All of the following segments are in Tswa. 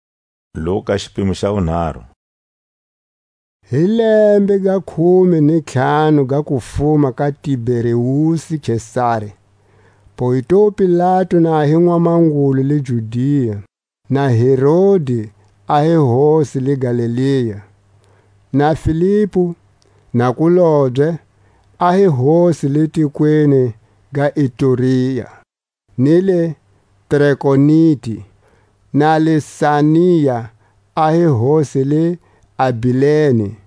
A ntiro wa Johani Mubapatizi. Hi lembe ga khume ni ntlhanu ga kufuma ka Tiberiusi Kesari, Pontiu Pilatu na hi mwamangulu le Judia, na Herodi a hi hosi le Galilea, na Filipu nakulobye a hi hosi le tikweni ga Iturea ni le Trakoniti, na Lisania a hi hosi le Abileni,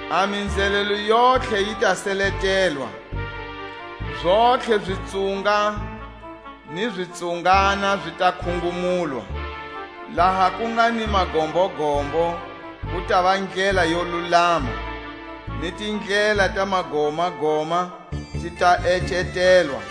A minzhelelo yontlhe yi ta seletelwa, Zontlhe zitsunga ni zitsungana zi ta khungumulwa; Laha ku nga ni magombogombo ku tava ndlela yo lulama, Ni tindlela ta magomagoma ti ta ecetelwa;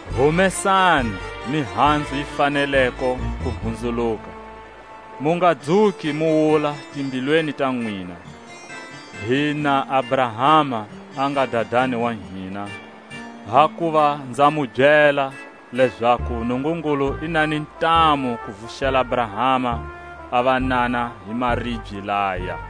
Humesani mihanzu yi faneleko kuhunzuluka, mu nga dzuki mu wula timbilwini ta nwina: Hi na Abrahama, a nga dadani wa hina; hakuva nza mu byela, lezaku Nungungulu i na ni ntamu ku vuxela Abrahama a vanana hi maribye laya.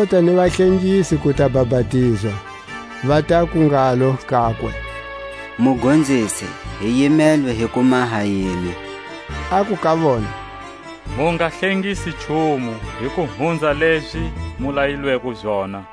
Ku lota ni vahlengisi ku ta bapatizwa, va taku ngalo kakwe: Mugonzisi, hi yimelwe hi ku maha yini? Aku ka vona: Mu nga hlengisi nchumu hi ku hunza lezi mu layilweko zona.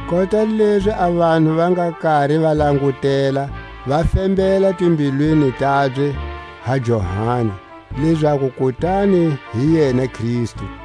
Kota lezi a vanhu va nga kari va langutela, va fembela timbilwini tabye ha Johani, lezaku kutani hi yena Kristu;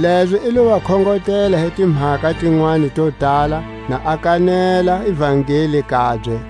Lezo i lo va khongotela hi timhaka tinwani to tala, na a kanela Ivangeli kabye.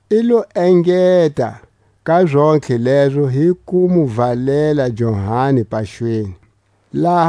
i lo engeta ka zontlhe lezo hi ku mu valela Johani paxweni. Jesu a bapatizwa.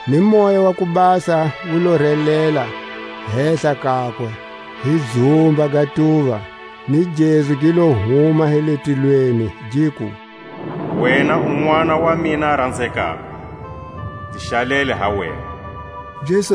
ni Moya wa ku Basa wu lo relela hehla kakwe hi dzumba ga tuva, ni gezu gi lo huma hi le tilweni, giku: Wena u Nʼwana wa mina a ranzekako, nzi xalele ha wena. Zizukulwana za Jesu.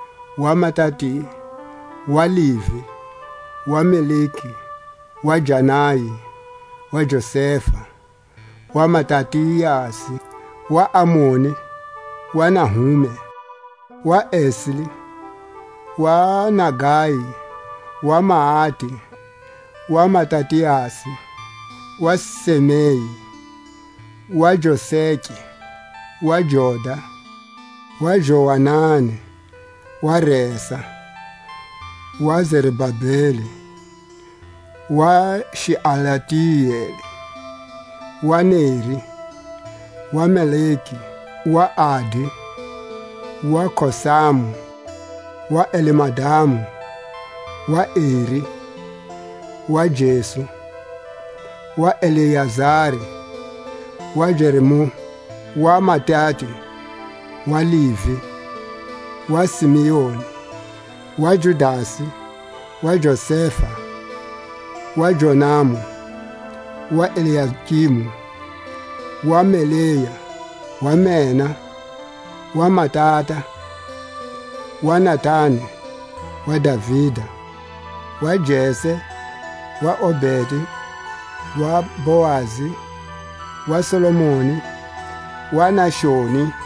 wa Matati, wa Levi, wa Melki, wa Janai, wa Josefa, wa Matatiasi, wa Amoni, wa Nahume, wa Esli, wa Nagai, wa Maati, wa Matatiasi, wa Semei, wa Joseke, wa Joda, wa Joanani, wa Resa, wa Zerubabeli, wa Xealtieli, wa Neri, wa Melki, wa Adi, wa Kosamu, wa Elmadamu, wa Eri, wa Jesu, wa Eliezeri, wa Jorimu, wa Matate, wa Levi, wa Simeoni, wa Judasi, wa Josefa, wa Jonamu, wa Eliakimu, wa Melea, wa Mena, wa Matata, wa Natani, wa Davida, wa Jese, wa Obedi, wa Boazi, Wa Salmoni, wa Naxoni,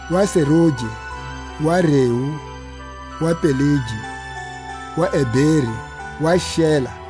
wa Seruge, wo Rewu, wa Pelegi; wa Eberi, wa Xela,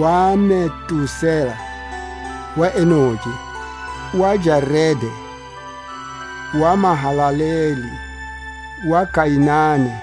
wa Metusela, wa Enoke, wa Jerede, wa Mahalaleli, wa Kainani,